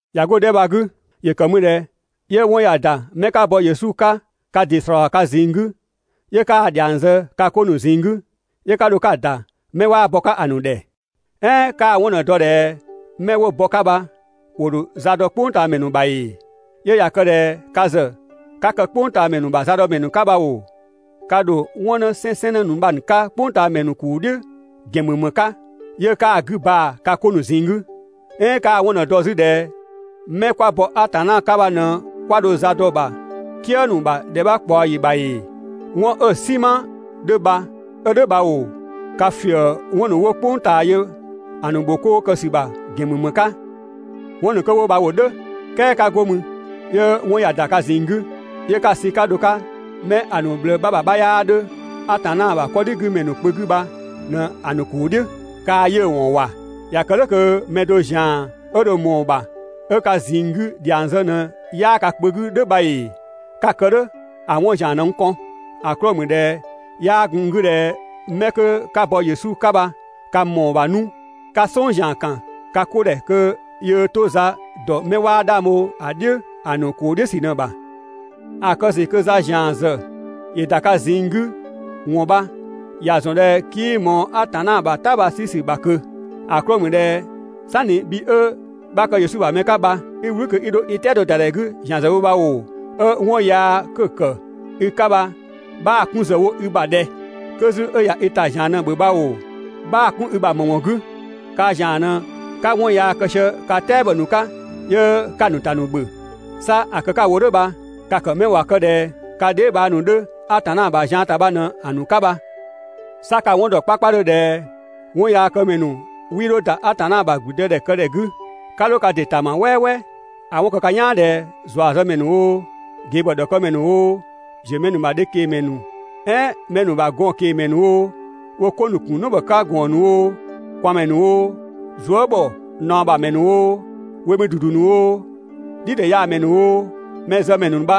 (꞊Ya 'go‑ 'dhɛ bha‑ 'gü,) ‑yö kë mü ꞊dhɛ 'yö 'wɔn ꞊ya ‑da 'mɛ 'ka bɔ Atanna 'ka ka ‑dɩ ‑slɔɔ ka ꞊zinng 'gü 'yö 'kaa‑ ‑dhiang zë ka 'ko ‑nu ꞊zinng 'gü, 'yö 'ka dho 'ka‑ ‑da 'mɛ 'waa bɔ‑ 'ka ‑a ‑nu ‑dhɛ. "Ɛɛn 'kaa‑ 'wɔn ꞊në‑ dɔ ꞊dhɛ 'mɛ 'wo bɔ‑ 'ka bha ‑wo ‑dho za dɔ "kpʋngtaamɛ ‑nu ‑bha ‑ee? 'Yö ꞊ya kë ꞊dhɛ ka ‑zë 'ka kë "kpʋngtaamɛ ‑nu ‑bha zadɔmɛ 'ka bha ‑oo, ka ‑dho 'wɔn 'nësɛnsɛnnë ‑nu bha‑ ‑nu 'ka "kpʋngtaamɛ ‑nu ‑kuu "dhiʋ̈ ‑gɛn ‑mü ‑më 'ka 'yö 'kaa‑ 'gü baa‑ ka 'ko ‑nu ꞊zinng 'gü? "Ɛɛn 'kaa‑ 'wɔn ꞊në‑ dɔ 'zü ꞊dhɛ 'mɛ 'kwa bɔ Atanna 'ka bha ꞊në 'kwa dho zaa dɔ‑ ‑bha "kië ‑nu ‑bha ‑dhɛ 'bha ꞊kpaɔ ‑yi ‑bha ‑ee? 'Wɔn 'ö‑ "sinma 'dhö bha 'ö "dhʋ̈ bha bha ‑oo, ka ‑fië 'wɔn ‑nu 'wo "kpʋng ꞊taa yö‑ ‑nu ‑bhokoo ‑sü ‑bha ‑gɛn ‑mü ‑më 'ka? 'Wɔn ‑nu 'kö 'wo bha ‑wo "dhʋ̈, "kɛɛ 'ka 'go mü 'yö 'wɔn ꞊ya ‑da ka ꞊zinng 'gü, 'yö 'ka‑ sü 'ka dho‑ 'ka 'mɛ ‑a ‑nu ꞊bhlëë 'bha ‑bha 'bha 'yaa 'dhö Atanna ‑bha 'kɔdhigümɛ ‑nu kpö 'gü bha ꞊në‑ ‑nu ‑kuu "dhiʋ̈! Kaa‑ 'yiʋ̈‑ ‑wɔn ‑wa! ꞊Ya kë "dhʋ̈ kö mɛ do ‑zian 'ö dho ꞊mɔɔ‑ ‑bha 'ö ka ꞊zinng 'gü ‑dhiang zë ꞊në 'yaa ka kpö 'gü "dhʋ̈ bha ‑ee? 'Ka‑ kë "dhʋ̈ ‑a 'wɔn ‑zian ꞊në n kɔn. ‑A 'klɔɔ‑ ‑mü ꞊dhɛ 'yaa gun n 'gü ꞊dhɛ 'mɛ 'kö 'ka bɔ Yesu 'ka bha ka ‑mɔɔ ‑bha 'nu 'ka "sɔng ‑zian ‑kan ka 'ko ‑dhɛ kö yöö 'to‑ ‑za ‑dɔ 'mɛ 'waa 'dhang bho‑ "dhiʋ̈ ‑a ‑nu ‑kuu "dhiʋ̈ ‑sü ꞊në‑ ‑bha. ‑A kë ‑sü kö za ‑zian ‑zë ‑yö ‑da ka ꞊zinng 'gü ‑wɔn bha, ‑ya ‑zɔn ꞊dhɛ 'kii ꞊mɔɔ Atanna ‑bha "ta bha‑ 'sü ‑sü ‑bha ꞊kö. ‑A 'klɔɔ‑ ‑mü ꞊dhɛ "sanni bhi 'ö 'bha kë Yesu ‑bha mɛ 'ka bha 'i "wlü kö 'i 'dho i "tɛado ‑da ‑dhɛ 'gü ‑zian zë wo bha ‑oo, 'ö 'wɔn yaa 'kö‑ ‑kë i 'ka bha 'bhaa‑ 'kun ‑zë wo i ‑bha ꞊dhɛ? 'Kö 'zü 'ö ꞊ya i ‑ta ‑zian ꞊në‑ ‑bhö bha ‑oo, 'bhaa‑ 'kun i ‑bha ‑më ‑wɔn 'gü? Kaa ‑zian ꞊në 'ka 'wɔn yaa kë sië ka "tɛabɔ ‑nu 'ka 'yö 'ka‑ ‑nu ‑ta ‑nu ‑bhö. 'Sa ‑a kë 'ka‑ wo "dhʋ̈ bha, ka‑ ‑kë 'mɛ ꞊wa kë ꞊dhɛ ka dheebhang ‑nu 'dhö Atanna ‑bha zian ‑ta bha ꞊në‑ ‑nu 'ka bha! 'Sa ka‑ 'wɔn dɔ 'kpakpadhö ꞊dhɛ 'wɔnyaakëmɛ ‑nu 'wii 'dho ‑da Atanna ‑bha ‑gblüdëdhɛkëdhɛ 'gü. 'Ka 'dho ka ‑dɩ ‑ta ma "wɛɛwɛɛ: ‑a 'wɔn‑ kë ka "yaan ꞊dhɛ ‑zuazëmɛ ‑nu oo, ꞊gebhɔ ‑dhɔkëmɛ ‑nu oo, ‑ziö mɛ nu ‑bha dhe ꞊kengmɛ "ɛɛn mɛ ‑nu ‑bha gɔn ꞊kengmɛ ‑nu oo, wo 'ko ‑nu ‑kun "nɔbhɔ 'ka ‑gɔɔn ‑nu oo, ꞊kwaanmɛ ‑nu oo, zuë" ‑bhɔ ꞊naɔ ‑bha ‑mɛ ‑nu oo, we mü ‑dudu ‑nu oo, "dhidhɛyaamɛ ‑nu oo, mɛzëmɛ ‑nu bha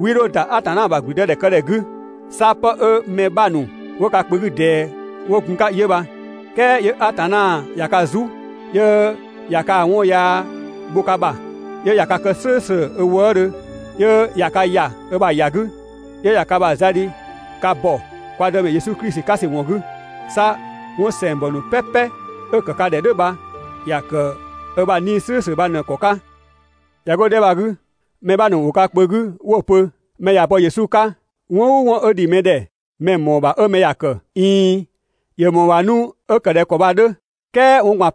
'wii 'dho ‑da Atanna ‑bha ‑gblüdëdhɛkëdhɛ 'gü. 'Sa 'pë 'ö mɛ 'bha ‑nu 'wo ka kpö 'gü ꞊dɛɛ 'wo gun‑ 'ka 'yö bha. "Kɛɛ 'yö Atanna ꞊ya ka "zu, 'yö ꞊ya kaa‑ 'wɔn yaa bho ka ‑bha, 'yö ꞊ya ka kë "slʋ̈ʋ̈slʋ̈ ö wëëdhö, 'yö ꞊ya ka ‑ya ö ‑bha ‑ya 'gü, 'yö ꞊ya ka ‑bha za dhi ka ‑bɔ kwa Dëmɛ Yesu Klisi 'ka ‑sü ‑wɔn 'gü. 'Sa 'wɔn ‑sɛngbɔ ‑nu "pɛpɛ 'ö‑ ‑kë ka ‑dhɛ "dhʋ̈ bha ‑ya ‑kë 'ö ‑bha 'Nii‑ "slʋ̈ʋ̈slʋ̈ bha ꞊në‑ ‑kɔ 'ka. ꞊Ya 'go‑ 'dhɛ bha‑ 'gü, mɛ 'bha ‑nu ‑wo ka kpö 'gü 'wo‑ pö: «Mɛ ꞊ya bɔ Yesu 'ka, 'wɔn "ʋʋ 'wɔn 'ö ‑dhi mɛ ‑dhɛ 'mɛ‑ ‑mɔɔ ‑bha 'ö mɛ ‑ya ‑kë», ꞊iin, ‑yö ‑mɔɔ ‑bha 'nu 'ö ‑kë ꞊dhɛ ‑kɔ bha‑ 'dhö, "kɛɛ 'wɔn ꞊gban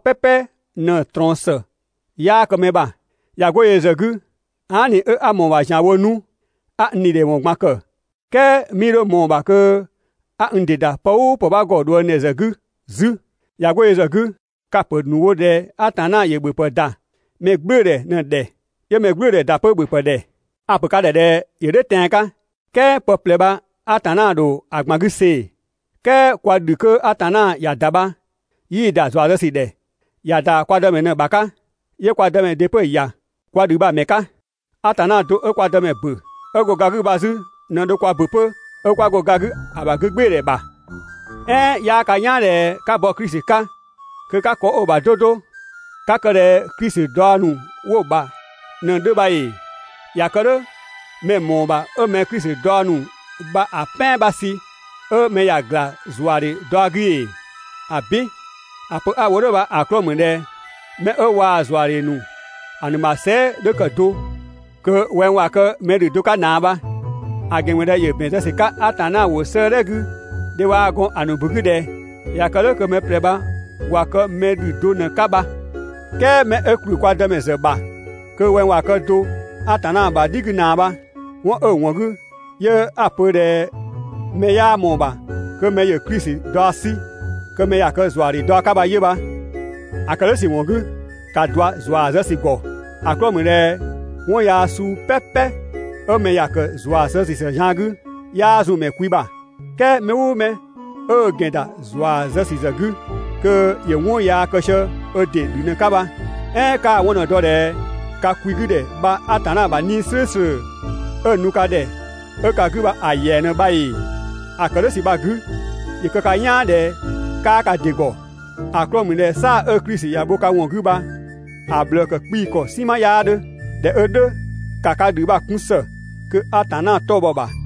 ꞊në‑ ꞊trɔɔn ‑së 'yaa kë mɛ ‑bha. ꞊Ya 'go yö ‑zë 'gü, aa" ꞊ni 'ö 'a ꞊mɔɔ‑ ‑bha ‑zianwo 'nu 'a n ‑dhidhɛwɔn ꞊gban ‑kë, "kɛɛ 'mii 'dho ꞊mɔɔ‑ ‑bha kö 'a n ‑dɩ ‑da pë "ʋʋ pë 'bha ‑gɔ ꞊dhuëngdhɛ ‑zë 'gü 'zü. ꞊Ya 'go yö ‑zë 'gü, ka‑ ‑pö ‑nu wo ꞊dhɛ Atanna ‑yö ‑bhöpë ‑da mɛ "gblʋ̈ʋ̈dhɛ ꞊në‑ ‑dhɛ, 'yö mɛ "gblʋ̈ʋ̈dhɛ ‑da 'pö ‑bhöpë ‑dhɛ.» A‑ ‑pö ka ‑dhɛ ꞊dhɛ ‑yö "dhʋ̈ tɛan‑ 'ka, "kɛɛ pë ꞊plɛ bha Atanna ‑dho ‑a ꞊gban 'gü see‑. "Kɛɛ kwa ‑dhü 'kö Atanna ‑ya ‑da bha 'yii‑ ‑da ‑zua zë ‑sü ‑dhɛ. ‑Ya ‑da kwa Dëmɛ ꞊në ‑bha 'ka, 'yö kwa Dëmɛ ‑dɩ 'pö‑ ‑ya kwa ‑dhü bha‑ ‑mɛ 'ka. Atanna do 'ö kwa Dëmɛ ‑bö 'ö go ga 'gü bha 'zü ꞊në dho kwa ‑bö 'pö 'ö 'kwa go ga 'gü ‑a ‑bha 'gügbɩɩdhɛ ‑bha. "Ɛɛn 'yaa ka "yaan ꞊dhɛ 'ka bɔ Klisi 'ka kö 'ka ‑kɔ 'ö‑ ‑bha 'do 'do, 'ka kë ꞊dhɛ Klisi daɔ ‑nu 'wo‑ bha ꞊në‑ 'dhö bha ‑ee? ꞊Ya kë "dhʋ̈ mɛ‑ ‑mɔɔ ‑bha 'ö mɛ‑ Klisi daɔ ‑nu bha‑ "pɛan 'bha sü 'ö mɛ ‑ya ‑gla ‑zuadhe daɔ 'gü ‑ee? ‑Abin! ‑A pö 'a‑ wo "dhʋ̈ bha‑ 'klɔɔ‑ ‑mü ꞊dhɛ 'mɛ 'ö waa ‑zuadhe ‑a ‑nu ‑bha sɛɛ" 'dhö ‑kë do, kö wɛng ꞊wa kë mɛ ‑dhü do 'ka ꞊naa bha. ‑A ‑gɛn ‑mü ꞊dhɛ ‑yö ‑bɛn zë ‑sü 'ka Atanna ‑wʋ 'sëëdhɛ 'gü dhe waa‑ gɔn ‑a ‑nu ‑bu 'gü ꞊dhɛ: «꞊Ya kë "dhʋ̈ kö mɛ ꞊plɛ bha ꞊wa kë mɛ ‑dhü do ꞊në‑ 'ka bha.» "Kɛɛ 'mɛ 'ö ‑kplü kwa Dëmɛ ‑bha kö wɛng ꞊wa kë do Atanna ‑bha "dhi 'gü ꞊naa bha, ('wɔn 'ö‑ ‑wɔn 'gü 'yö 'a‑ pö ꞊dhɛ mɛ 'yaa ꞊mɔɔ‑ ‑bha kö ‑yö Klisi daɔ 'sü kö ‑ya kë ‑zuadhe daɔ 'ka bha 'yö bha). ‑A ‑kë "dhʋ̈ ‑sü ‑wɔn 'gü, ‑ka ꞊dua ‑zua zë ‑sü ‑gɔ! ‑A 'klɔɔ‑ ‑mü ꞊dhɛ 'wɔn yaa suu "pɛpɛ 'ö mɛ ya ‑kë ‑zua zë ‑sü ‑zë zian 'gü, 'yaa zun mɛ kwi ‑bha. "Kɛɛ mɛ "ʋʋ mɛ 'ö ö ‑gɛn ‑da ‑zua zë ‑sü 'gü, kö ‑yö 'wɔn yaa kë sië ö ‑dɩ ‑dhü ꞊në‑ 'ka bha. "Ɛɛn 'kaa‑ 'wɔn ꞊në‑ dɔ ꞊dhɛ ka kwi 'gü ‑dhɛ bha Atanna ‑bha 'Nii‑ "slʋ̈ʋ̈slʋ̈ 'ö‑ nu ka ‑dhɛ 'ö ka 'gü bha‑ ‑yɛa ꞊në bha ‑ee? ‑A ‑kë "dhʋ̈ ‑sü bha‑ 'gü, ‑yö kë ka "yaan ꞊dhɛ 'kaa ka ‑dɩ ‑gɔ. ‑A 'klɔɔ‑ ‑mü ꞊dhɛ "saa‑ 'ö Klisi ‑ya bho ka ‑wɔn 'gü bha‑ ꞊bhlëë ‑kë 'kpii‑ ‑kɔ "sinma 'yaa 'dhö. ꞊Dhɛ 'ö "dhʋ̈, ‑ka ka ‑dhü bha‑ 'kun ‑së kö Atanna 'tɔ‑ bhɔ‑ ‑bha.